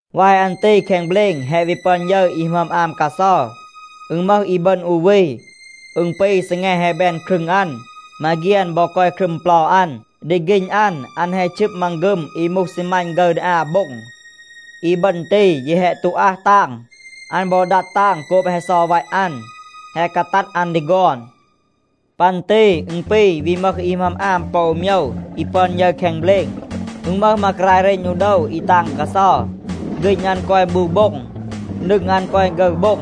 วาย อัน ตี แคง เบลณ แฮะ วี ปึอน ยึร อี หมึอม อาม กาเซา. อึณ มึห อีบึณ อู วี. อึณ ปี, ซีแง แฮะ แบน ครึง อัน. มาเฆียน บอ กอย ครึม เปลา อัน. ดี ฆีณ อัน, อัน แฮะ ชึบ มังฆึม อี มูห ซีมัณ ฆึร ดี อา โบ็ง. อีบึณ ตี, ยี แฮะ ตู อัห ตาง. อัน บอ ดัด ตาง โกบ แฮะ เซา วัต อัน, แฮะ กาตัด อัน ดี ฆอน. ปัน ตี อึณ ปี วี มึห อี หมึอม อาม ปอ อู โมยว อี ปึอน ยึร แคง เบลณ. อึณ มึห มากราย เรณ อู โดว อี ตาง กาเซา. ฆีณ อัน กอย บู โบ็ง. นึง อัน กอย ฆึร โบ็ง.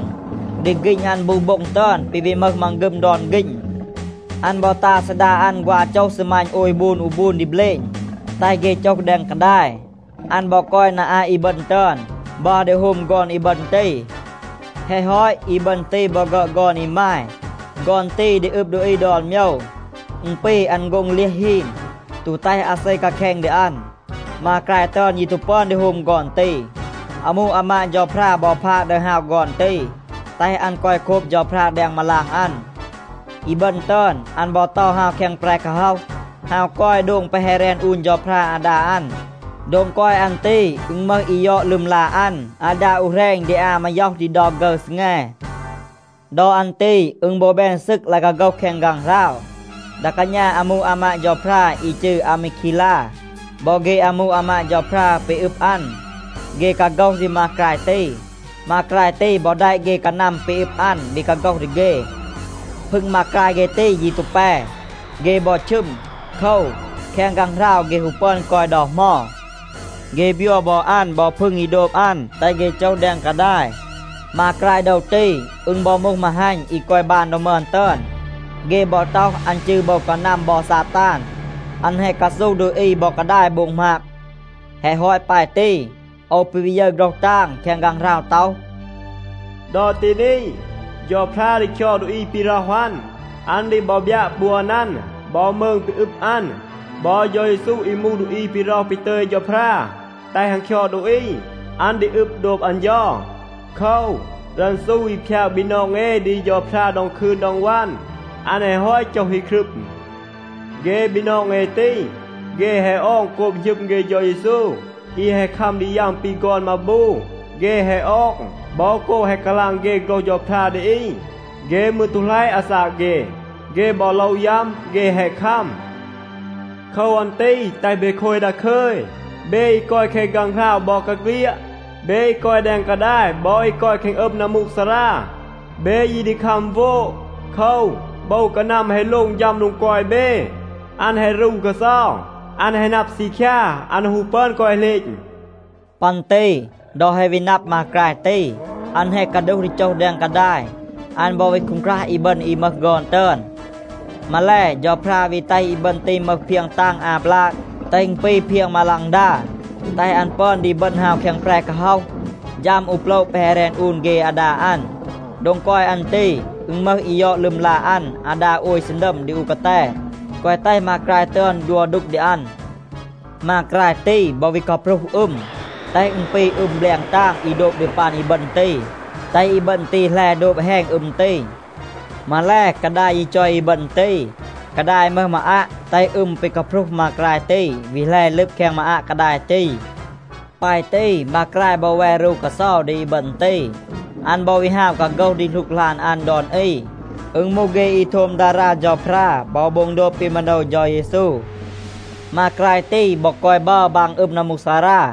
ดี ฆีณ อัน บู โบ็ง ตึอน ปี วี มึห มังฆึม ดอน ฆีณ. อัน บอ ตา ซีดา อัน ฆวา โจห ซีมัณ โอย บูน อู บูน ดี เบลณ, แตห เฆ โจห แดง กาดาย. อัน บอ กอย นา อาต อีบึณ ตึอน, บัร ดี โฮม ฆอน อีบึณ ตี. แฮะ ฮอต, อีบึณ ตี บอ ฆึอด ฆอน อีมาย. ฆอน ตี ดี อึบ ดูอี ดอน โมยว. อึณ ปี อัน โฆ็ง เลียห ฮีน, ตู แตห อาเซ กาแคณ ดี อัน. มากราย ตึอน ยี ตู ปึอน ดี โฮม ฆอน ตี. อามู อามาด เฌาพรา บอ พาด ดึห ฮาว ฆอน ตี, แตห อัน กอย โคบ เฌาพรา แดง มาลาง อัน. อีบึณ ตึอน, อัน บอ เตา ฮาว แคง แปร กาฮ็อห, ฮาว กอย โดง แปะ แฮะ แรน อูน เฌาพรา อาดา อัน. โดง กอย อัน ตี, อึณ มึห อี ยอด ลึมลา อัน อาดา อู แหรณ ดี อา มาย็อห ดี เดา ฆึร ซีแง. ดอ อัน ตี อึณ บอ แบน ซึก ลาย กาโฆห แคง ฆางหราว. ดา กาณา อามู อามาด เฌาพรา อี จืร อามีคีลา บอ เฆ อามู อามาด เฌาพรา ปี อึบ อัน, เฆ กาโฆห ดี มากราย ตี. มากราย ตี บอ แดะ เฆ กานัม ปี อึบ อัน, วี กาโฆห ดี เฆ. พึง มากราย เฆ ตี ยี ตู แป, เฆ บอ ชึม. โคว, แคง ฆางหราว เฆ ฮู ปึอน กอย ดอ เหมา. เฆ บยัว บอ อัน บอ พึง อี โดบ อัน, แตห เฆ โจห แดง กาดาย. มากราย โดว ตี, อึณ บอ มูห มาฮัณ อี กอย บาน ดอ มึอน ตึอน. เฆ บอ ต็อห, อัน จืร โบว กานัม บอ ซาตาน. อัน แฮะ กาซูห ดูอี บอ กาดาย โบง หมาบ. แฮะ ฮอต ปาย ตี, โอว ปี วี ยึร โฆรห ตาง แคง ฆางหราว ต็อห, “ดอ ตี นี, เฌาพรา ดี คยอด ดูอี ปี ร็อห อัน. อัน ดี บอ บยัะ ปวน อัน บอ มืง ปี อึบ อัน. บอ เฌา เยซู อี มูห ดูอี ปี ร็อห ปี ตึย เฌาพรา แตห อัน คยอด ดูอี, อัน ดี อึบ โดบ อัน เฌา. โคว, รันซู อี พยาก บีนอง เอ ดี เฌาพรา ดอง คืน ดอง วัน, อัน แฮะ ฮอต โจห อี ครึม. เฆ บีนอง เอ ตี, เฆ แฮะ ออง โกบ หณึม เฆ เฌา เยซู อี แฮะ คัม ดี ยัม ปี ฆอน มาบู. เฆ แฮะ ออง บอ โกบ แฮะ กาลาง เฆ โฆรห เฌาพรา ดี อี. เฆ มืร ตู หลัยะ อาซาก เฆ. เฆ บอ โลว ยัม, เฆ แฮะ คัม. โคว อัน ตี แตห เบ โคย ดาคึย, เบ อี กอย แคง ฆางหราว บอกาเฆลียด. เบ อี กอย แดง กาดาย บอ อี กอย แคง อึม นัมมูกซารา, เบ ยี ดี คัม โวด. โคว, โบว กานัม แฮะ โลง ฌัม โดง กอย เบ. อัน แฮะ รู กาเซา. อัน แฮะ นับ ซีคยา, อัน ฮู ปึอน กอย เหลณ.” ปัน ตี ดอ แฮะ วี นับ มากราย ตี, อัน แฮะ กาดูห ดี โจห แดง กาดาย, อัน บอ วี คูงครัห อีบึณ อี มึห ฆอน ตึอน. มาแล, เฌาพรา วี แตห อีบึณ ตี มึห เพียง ตาง อา บลาก, แตห อึณ ปี เพียง มาฆลาง, แตห อัน ปึอน ดี บึณ ฮาว แคง แปร กาฮ็อห, ฌัม อู โปละ แปะ แฮะ แรน อูน เฆ อาดา อัน. โดง กอย อัน ตี, อึณ มึห อี ยอด ลึมลา อัน อาดา โอย ซีนัม ดี อู กาแต, แกวะ แตห มากราย ตึอน ดัว ดูก ดี อัน. มากราย ตี บอ วี กาพรูห อึม, แตห อึณ ปี อึม แบลง ตาง อี โดบ ดี ปัน อีบึณ ตี, แตห อีบึณ ตี แหล โดบ แฮณ อึม ตี. มาแล, กาดาย ยี จอย อีบึณ ตี. กาดาย มึห มาอัะ, แตห อึม ปี กาพรูห มากราย ตี วี แหล ลึบ แคง มาอัะ กาดาย ตี. ปาย ตี, มากราย บอ แว รู กาเซา ดี อีบึณ ตี. อัน บอ วี ฮาว กาโฆห ดี หลูกหลาน อัน ดอน อี. อึณ มูห เฆ อี โทม ดารา เฌาพรา บอ โบง โดบ ปี มาโนว เฌา เยซู. มากราย ตี บอ กอย บัร บาง อึม นัมมูกซารา.